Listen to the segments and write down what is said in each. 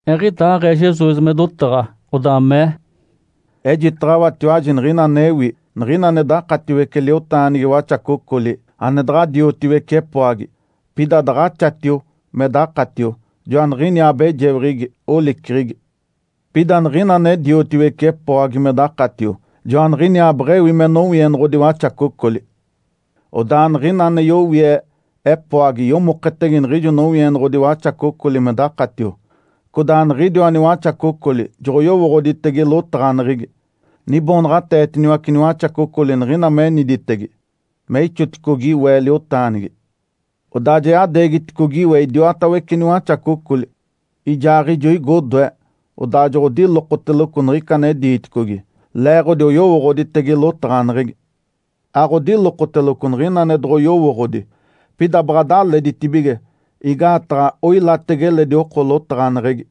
Eɡ̶idaaɡ̶ee Jesus me dotaɡ̶a, odaa mee, “Ejitaɡ̶awatiwaji niɡ̶ina anewi. Niɡ̶ina ane dakatiwece liotaanigi waxacocoli, ane daɡ̶a diotiwece epoagi, pida daɡ̶axatio me dakatio, joaniɡ̶iniaa abejeweɡ̶egi, oliceɡ̶egi. Pida niɡ̶ina ane diotiwece epoagi me dakatio, joaniɡ̶iniaa beɡ̶ewi me nowienoɡ̶odi waxacocoli. Odaa niɡ̶ina ane yowie epoagi yomoketege niɡ̶ijo nowienoɡ̶odi waxacocoli me dakatio, codaa niɡ̶idiwa niwaxacocoli joɡ̶oyowooɡ̶oditege lotaɡ̶aneɡ̶egi. Niboonaɡ̶ateetiniwace niwaxacocoli niɡ̶ina meniditege me ixoticogi we liotaanigi. Odaa ja yadeegitedicogi we idiwatawece niwaxacocoli, ijaaɡ̶ijo igo odoe, odaa joɡ̶odilokoteloco niɡ̶ica ane diiticogi, leeɡ̶odi oyowooɡ̶oditege lotaɡ̶aneɡ̶egi. Aɡ̶odilokoteloco niɡ̶ina ane doɡ̶oyowooɡ̶odi. Pida baɡ̶a daleditibige igaataɡ̶a oilatege eledi oko lotaɡ̶aneɡ̶egi”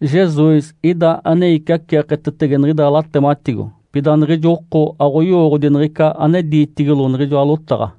Jesus ida ane iciaceeketetege niɡ̶ida latematigo, pida niɡ̶ijo oko aɡ̶oyowooɡ̶odi niɡ̶ica ane diitigilo niɡ̶ijoa lotaɡ̶a.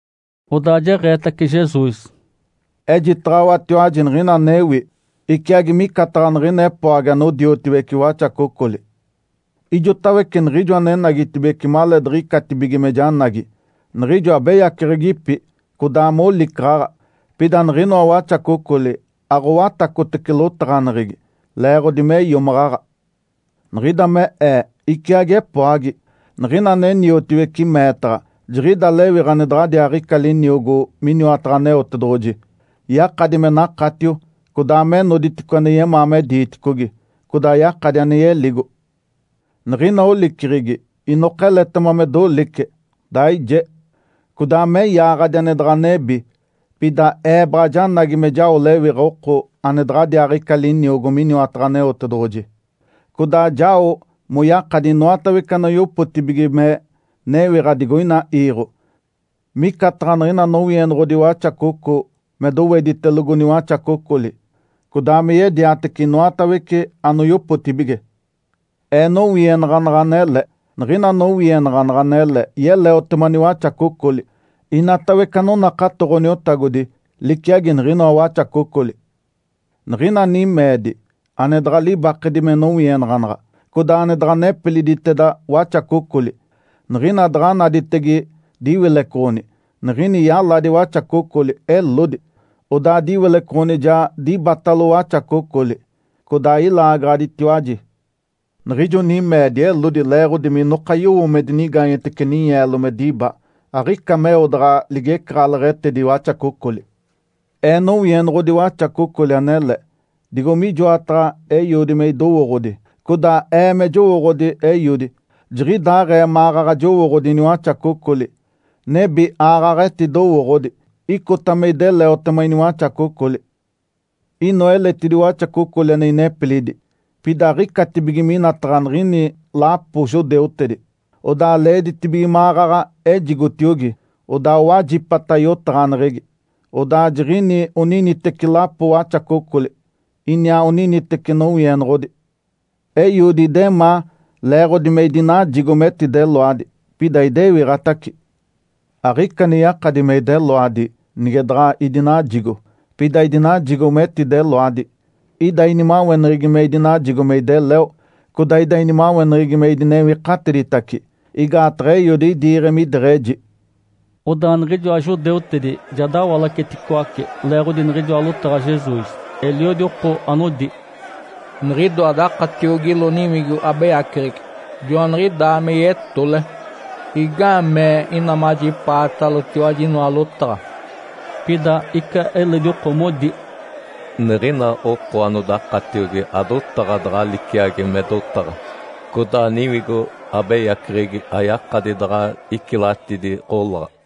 Odaa jeɡ̶eetace Jesus, “Ejitaɡ̶awatiwaji niɡ̶ina anewi. Iciagi micataɡ̶a niɡ̶ina epoagi anodiotiwece waxacocoli. Ijotawece niɡ̶ijo anenagitibeci maleediɡ̶icatibige me janagi, niɡ̶ijo abeyaceɡ̶egipi, codaa molicaɡ̶aɡ̶a. Pida niɡ̶inoa waxacocoli aɡ̶owatacotece lotaɡ̶aneɡ̶egi leeɡ̶odi me iomaɡ̶aɡ̶a. Niɡ̶ida me Ee iciagi epoagi. Niɡ̶ina ane niotiwece meetaɡ̶a, jiɡ̶ida lewiɡ̶a ane daɡ̶adiaaɡ̶ica liniogo miniwataɡ̶a Aneotedoɡ̶oji. Yakadi me nakatio, codaa me noditice ane yemaa me diiticogi, codaa yakadi ane yeligo. Niɡ̶ina oliceɡ̶egi inoka eletema me dolice, daije, codaa me yaaɡ̶adi ane daɡ̶a nebi. Pida Ee baɡ̶a janagi me jao lewiɡ̶a oko ane daɡ̶adiaaɡ̶ica liniogo miniwataɡ̶a Aneotedoɡ̶oji codaa jao moyakadi inoatawece anoyopotibige me newiɡ̶a digoina iiɡ̶o, micataɡ̶a niɡ̶ina nowienoɡ̶odi waxacoco me doweditelogo niwaxacocoli, codaa me yediatece inoatawece anoyopotibige. Ee nowienaɡ̶anaɡ̶a anele. Niɡ̶ina nowienaɡ̶anaɡ̶a anele yeleotema niwaxacocoli. (Inatawece anonakato Ǥoniotagodi liciagi niɡ̶inoa waxacocoli.) Niɡ̶ina nimeedi, ane daɡ̶a libakedi me nowienaɡ̶anaɡ̶a, codaa ane daɡ̶a nepiliditeda waxacocoli. Niɡ̶ina daɡ̶a naditege diwilecoɡ̶oni, niɡ̶ini yaladi waxacocoli, elodi. Odaa diwilecoɡ̶oni ja dibatalo waxacocoli, codaa ilaagaɡ̶aditiwaji. Niɡ̶ijo nimeedi elodi leeɡ̶odi minoka yowo me dinigaanyetece ninyeelo me diba. Aɡ̶ica meo daɡ̶a ligecaɡ̶aleɡ̶etedi waxacocoli. Ee nowienoɡ̶odi waxacocoli anele. Digo mijoataɡ̶a Eiodi me idowooɡ̶odi, codaa Ee me jowooɡ̶odi Eiodi, jiɡ̶idaaɡ̶ee maɡ̶aɡ̶a jowooɡ̶odi iniwaxacocoli, nebi aaɡ̶aɡ̶a etidowooɡ̶odi. Icota me ideleotema iniwaxacocoli. Inoa eletidi waxacocoli ane inepilidi, pida aɡ̶icatibige minataɡ̶a niɡ̶ini lapo judeutedi. Odaa leeditibige maɡ̶aɡ̶a ejigotiogi. Odaa owajipata yotaɡ̶aneɡ̶egi, odaa jiɡ̶ini oniniteci lapo waxacocoli, iniaa oniniteci nowienoɡ̶odi. Eiodi idemaa leeɡ̶odi me idinajigo metideloadi, pida idewiɡ̶atace. Aɡ̶ica ane yakadi me ideloadi, nige daɡ̶a idinajigo, pida idinajigo me etideloadi. Ida inimaweneɡ̶egi me idinajigo me ideleo, codaa ida inimaweneɡ̶egi me idinewikatiditaci. Igaataɡ̶a Eiodi idiiɡ̶e mideɡ̶eji.” Odaa niɡ̶ijoa judeutedi ja dawalacetacicoace leeɡ̶odi niɡ̶ijoa lotaɡ̶a Jesus. Eliodi oko anodi, “Niɡ̶idoa dakatiogilo niwigo abeyaceɡ̶egi, joaniɡ̶idaa me yetole. Igaamee ina majipaatalotiwaji inoa lotaɡ̶a?” Pida ica eledi oko modi, “Niɡ̶ina oko anodakatiogi adotaɡ̶a daɡ̶a liciagi me dotaɡ̶a. Codaa niwigo abeyaceɡ̶egi ayakadi daɡ̶a icilatidi ɡ̶olaɡ̶a”.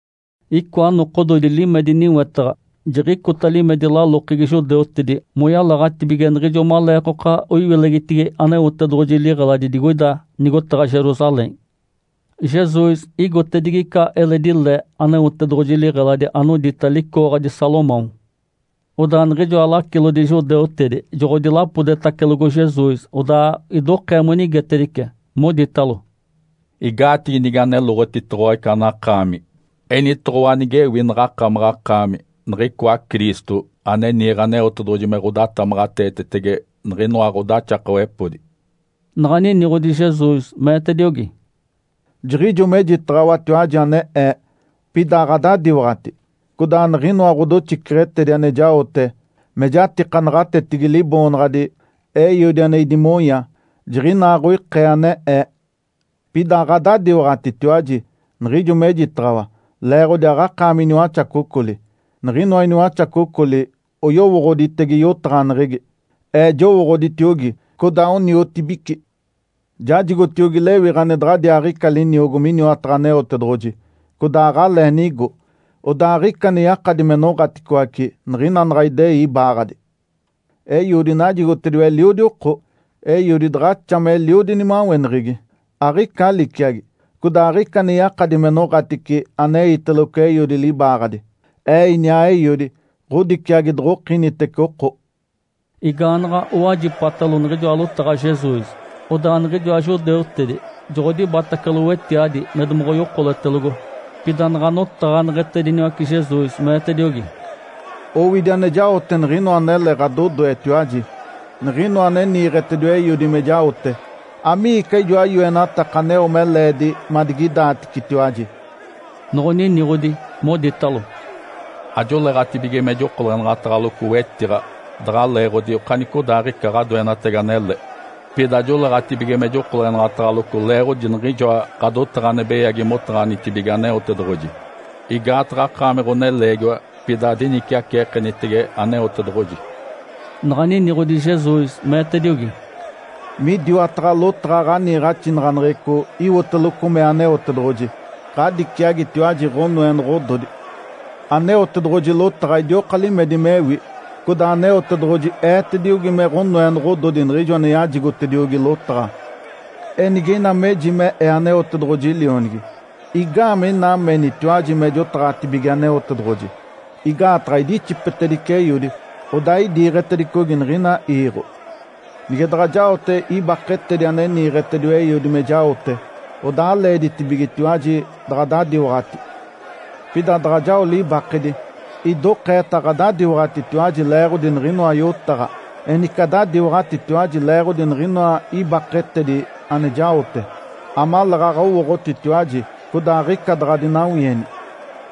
Icoa nokododi limedi niwetaɡ̶a. Jiɡ̶icota limedi lalokegi judeutedi moyalaɡ̶atibige niɡ̶ijo maleekoka oiwilegitigi Aneotedoɡ̶oji liɡ̶eladi digoida nigotaɡ̶a Jerusalém. Jesus igotedigi ica eledi le Aneotedoɡ̶oji liɡ̶eladi anodita, “Licooɡ̶adi Salomão”. Odaa niɡ̶ijoa lacilodi judeutedi joɡ̶odilapodetacelogo Jesus, odaa idokee monigetedice, moditalo, “Igaatigi nige aneloɡ̶otitoɡ̶owa ica anakaami? Enitoɡ̶owa nigewi naɡ̶akamaɡ̶akaami niɡ̶icoa Cristo, ane niiɡ̶e Aneotedoɡ̶oji me ɡ̶odatamaɡ̶ateetetege niɡ̶inoa ɡ̶odaxakawepodi.” Naɡ̶a niniɡ̶odi Jesus, meetediogi, “Jiɡ̶ijo mejitaɡ̶awatiwaji ane Ee, pida aɡ̶adadiwaɡ̶ati. Codaa niɡ̶inoa ɡ̶odoxiceɡ̶etedi ane jaote, me jatika naɡ̶atetigi Liboonaɡ̶adi Eiodi ane idimonya, jiɡ̶inaaɡ̶oikee ane Ee. Pida aɡ̶adadiwaɡ̶atitiwaji niɡ̶ijo mejitaɡ̶awa, leeɡ̶odi aɡ̶akaami iniwaxacocoli, Niɡ̶inoa iniwaxacocoli oyowooɡ̶oditege yotaɡ̶aneɡ̶egi. Ee jowooɡ̶oditiogi, codaa oniotibici. Jajigotiogi lewiɡ̶a ane daɡ̶adiaaɡ̶ica liniogo miniwataɡ̶a Aneotedoɡ̶oji, codaa aɡ̶alee nigo. Odaa aɡ̶ica ane yakadi me noɡ̶aticoace niɡ̶ina naɡ̶a idei ibaaɡ̶adi. Eiodi najigotediwa eliodi oko. Eiodi daɡ̶axa meliodi nimaweneɡ̶egi, aɡ̶ica liciagi. Codaa aɡ̶ica ane yakadi me noɡ̶atice aneiteloco Eiodi libaaɡ̶adi. Ee iniaa Eiodi, ɡ̶odiciagi doɡ̶okinitece oko.” Igaanaɡ̶a owajipatalo niɡ̶ijoa lotaɡ̶a Jesus, odaa niɡ̶ijoa judeutedi joɡ̶odibatacalo wetiadi me domoɡ̶oyokoletelogo. Pida naɡ̶a notaɡ̶aneɡ̶etediniwace Jesus, meetediogi, “Owidi ane jaote niɡ̶inoa anele ɡ̶adodoetiwaji, niɡ̶inoa ane niiɡ̶etediwa Eiodi me jaote. Amiica ijoa yoenataka aneo me leedi madigidaaticetiwaji?” Noɡ̶oniniɡ̶odi, moditalo, “Ajoleeɡ̶atibige me jokolenaɡ̶ataɡ̶aloco wetiɡ̶a daɡ̶a leeɡ̶odi okanicodaaɡ̶ica ɡ̶adoenatagi anele. Pida joleeɡ̶atibige me jokolenaɡ̶ataɡ̶aloco leeɡ̶odi niɡ̶ijoa ɡ̶adotaɡ̶a ane beyagi motaɡ̶anitibige Aneotedoɡ̶oji. Igaataɡ̶a akaami ɡ̶oneleegiwa, pida adiniciaceekenitege Aneotedoɡ̶oji”. Naɡ̶a niniɡ̶odi Jesus, meetediogi, “Midiwataɡ̶a lotaɡ̶a ɡ̶aniiɡ̶axinaɡ̶aneɡ̶eco iwoteloco mee Aneotedoɡ̶oji, ‘Ǥadiciagitiwaji ɡ̶onoenoɡ̶ododi’. Aneotedoɡ̶oji lotaɡ̶a idioka limedi mewi, codaa Aneotedoɡ̶oji eetediogi me ɡ̶onoenoɡ̶ododi niɡ̶ijo ane yajigotediogi lotaɡ̶a. Enige ina meji me Ee Aneotedoɡ̶oji Lionigi, igaamee ina menitiwaji me jotaɡ̶atibige Aneotedoɡ̶oji? Igaataɡ̶a idixipetedice Eiodi, odaa idiiɡ̶etedicogi niɡ̶ina iiɡ̶o. Nige daɡ̶a jaote ibaketedi ane niiɡ̶etediwa Eiodi me jaote, odaa aleeditibigetiwaji daɡ̶adadiwaɡ̶ati. Pida daɡ̶a jao libakedi, idokeeta aɡ̶adadiwaɡ̶atitiwaji leeɡ̶odi niɡ̶inoa yotaɡ̶a, enice adadiwaɡ̶atitiwaji leeɡ̶odi niɡ̶inoa ibaketedi ane jaote, amaleeɡ̶aɡ̶a owooɡ̶otitiwaji, codaa aɡ̶ica daɡ̶adinawieni,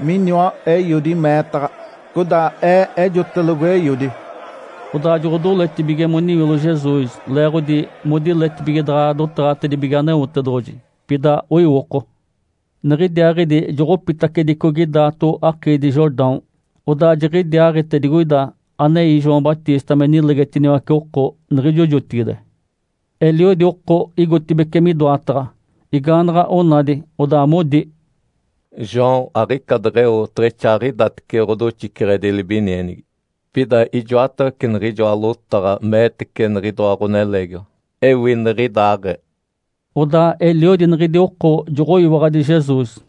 miniwa Eiodi meetaɡ̶a, codaa Ee ejotelogo Eiodi.” Odaa joɡ̶odoletibige moniwilo Jesus leeɡ̶odi modiletibige daɡ̶a dotaɡ̶atedibige Aneotedoɡ̶oji, pida oiwoko. Niɡ̶idiaaɡ̶idi joɡ̶opitacedicogi daato akiidi Jordão. Odaa jiɡ̶idiaaɡ̶ite digoida anei João Batista me nilegetiniwace oko niɡ̶ijo jotigide. Eliodi oko igotibeci midoataɡ̶a, igaanaɡ̶a onadi, odaa modi, “João aɡ̶ica deɡ̶eo oteɡ̶exaaɡ̶idatece ɡ̶odoxiceɡ̶edi libinienigi, pida ijoatawece niɡ̶ijoa lotaɡ̶a meetece niɡ̶idoa ɡ̶oneleegiwa, ewi niɡ̶idaaɡ̶ee”. Odaa eliodi niɡ̶idi oko joɡ̶oyiwaɡ̶adi Jesus.